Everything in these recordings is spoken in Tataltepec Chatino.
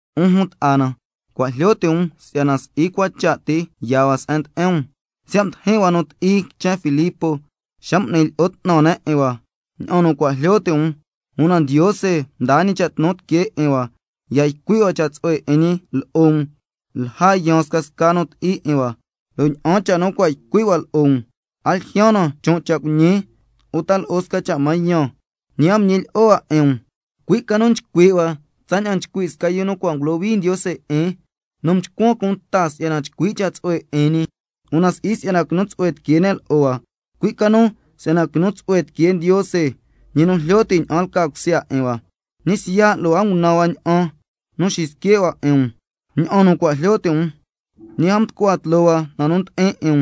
'Un jun ta'a na, cua' jlyo ti' um si'yana si'i cua cha' ti yaa hua se'en ndi'in um, siya' mdijin hua nu ti'i quichen Filipos xa m'ni lyi'o 'tnan ne' 'in hua, ña'an nu cua' jlyo ti' um, una Ndiose mdaa ñi cha' tnu tiquee 'in hua ya ycui' hua cha' tsu'hue 'in ñi lo'o um lja yaan scasca nu ti'i 'in hua. Lo' ña'an cha' nu cua' ycui' hua lo'o um, a ljyaan na chon' cha' cuiñi uta lo'o sca cha' mañan, ñi a mda'an ñilyi'o hua 'in um, cui' ca nu nchcui' hua tsaña'an nchcui' sca yu nu cua' ngulohui Ndiose 'in nu mchcuan cunta si'yana chcui' cha' tsu'hue 'in ñi, una si'i si'yana quinu tsu'hue tiquee ne' lo'o hua, cui' ca nu si'yana quinu tsu'hue tiquee Ndiose, ñi nu jlyo ti' ña'an lca cusya 'in hua. Ñi siya' lo' a ngunan hua ña'an xisque' hua 'in um, ña'an nu cua' jlyo ti' um, ñi a mducua tloo hua na nu ndi'in 'in um,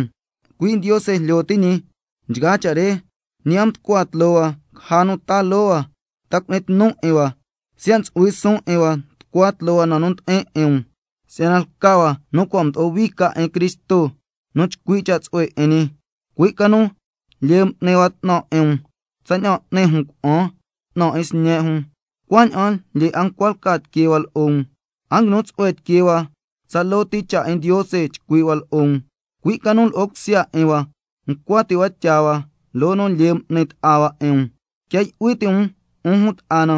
cui' Ndiose jlyo ti' ñi nchgaa cha' re. Ñi a mducua tloo hua caja nu taa loo hua, ta cu'ni tnu um 'in hua, siya' ntsu'hui suun 'in hua tucua tloo hua na nu ndi'in 'in um, si'yana lca hua nu cua' mdo'o hui ca 'in Cristo nu chcui' cha' tsu'hue 'in ñi. Cui' ca nu lyee m'ni hua 'tnan 'in um, tsaña'an n'ni jun cuna'an 'tnan 'in sñe' jun. Cuaña'an lyee 'a ncua lca tiquee hua lo'o um, a nguinu tsu'hue tiquee hua tsaloo ti cha' 'in Ndiose chcui' hua lo'o um, cui' ca nu lo'o cusya 'in hua ncua ti' hua tyaa hua loo nu lyee m'ni ta'a hua 'in um. Quia yu'hui ti' um, 'un jun ta'a na,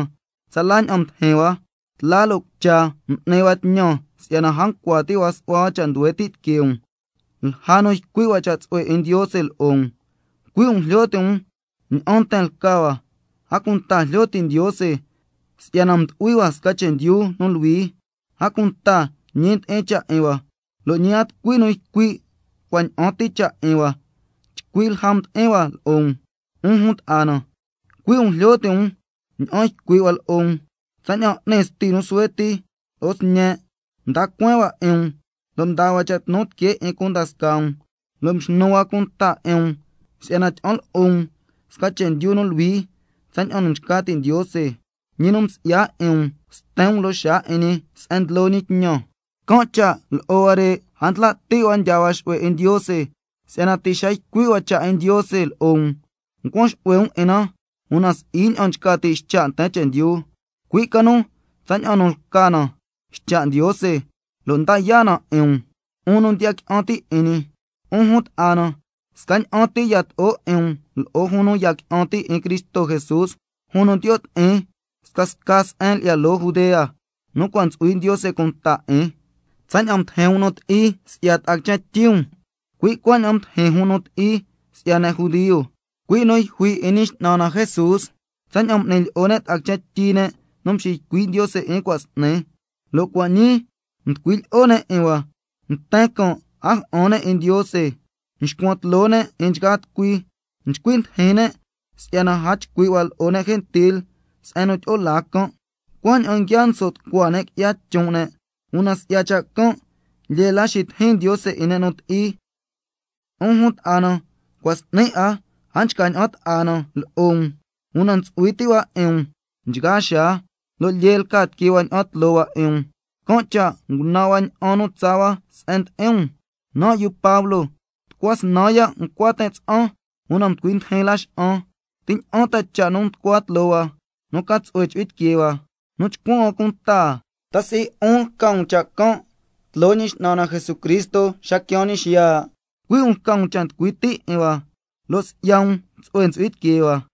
tsala ña'an mdijin hua, tla lo' cucha m'ni hua tñan si'yana a ncua ti' hua su'hua hua cha' nduhue ti' tiquee um lja nu ycui' hua cha' tsu'hue 'in Ndiose lo'o um. Cui' um jlyo ti' um ña'an nten lca hua, a cunta jlyo ti' Ndiose si'yana mdu'hui hua sca chendyu nu luhui, a cunta ñi ndi'in cha' 'in hua, lo' ñi a tucui nu ycui' cua' ña'an ti cha' 'in hua chcui lja nu mdi'in hua lo'o um, 'un jun ta'a na, cui' um jlyo ti' um ña'an ycui' hua lo'o um, tsaña'an n'ni sti nu suhue ti lo'o sñe', mda cueen hua 'in um lo' mdaa hua cha' tnu tiquee 'in cunda scaa um, lo' mxnu hua cunta 'in um si'yana tyi'an lo'o um sca chendyu nu luhui tsaña'an nu nchca ti' Ndiose, ñi nu msi'ya 'in um sten um loo xaa 'in ñi se'en ndlo ñi tñan. Can' cha' lo'o huare' a ndla' ti' hua ndyaa hua xu'hue 'in Ndiose, si'yana ti' xa nu ycui' hua cha' 'in Ndiose lo'o um ncuan xu'hue um 'in na, una si'i ña'an nchca ti' ycha' nten chendyu, cui' ca nu tsaña'an nu lca na ycha' Ndiose, lo' nda yaa' na 'in um, 'un nu ndiya qui'an ti' 'in ñi. 'Un jun ta'a na, scaña'an ti yato'o 'in um lo'o jun nu ya qui'an ti' 'in Cristo Jesús, jun nu ndiyo' ti'in scasca se'en lyi'ya loo Judea nu cua' ntsu'hui Ndiose cunta 'in. Tsaña'an mdijin um nu ti'i si'ya ta'a quichen tyi um, cui' cuaña'an mdijin jun nu ti'i si'ya ne' judio, cui' nu yjui 'in Ñi X'nan na Jesús, tsaña'an m'ni ne' lo'o ta'a quichen tyi ne' nu mxiycui' Ndiose 'in cua' s'ni, lo' cua' ñii mducui lyi'o ne' 'in hua. Nten can' a ja'an ne' 'in Ndiose, nxcuan tloo ne' 'in nchgaa tucui, nchcui ndijin ne' si'yana a chcui' hua lo'o ne' gentil se'en nu tyi'o laa can', cuaña'an nguia nso' tucua ne' qui'ya chon' ne', una si'ya cha' can' lyee la xitijin Ndiose 'in ne' nu ti'i. 'Un jun ta'a na, cua' s'ni a nchca ña'an ta'a na lo'o um, una ntsu'hui ti' hua 'in um nchgaa xaa, lo' lyee lca tiquee hua ña'an tloo hua 'in um, can' cha' ngunan hua ña'an nu tsaa hua se'en ndi'in um, lo' nan' yu Pablo, tucua snan ya' ncua tin' tsa'an, una mducui ndijin Laxa'an. ¿Ti ña'an ta cha' nu nducua tloo hua, nu ca tsu'hue ntsu'hui tiquee hua, nu chcuan hua cunta? ¿Ta si'i 'un lca um cha' can' tloo Ñi X'nan na Jesucristo xa nu quiaan ñi xiya'? Cui' um lca um cha' nducui' ti' 'in hua, lo' si'ya um tsu'hue ntsu'hui tiquee hua.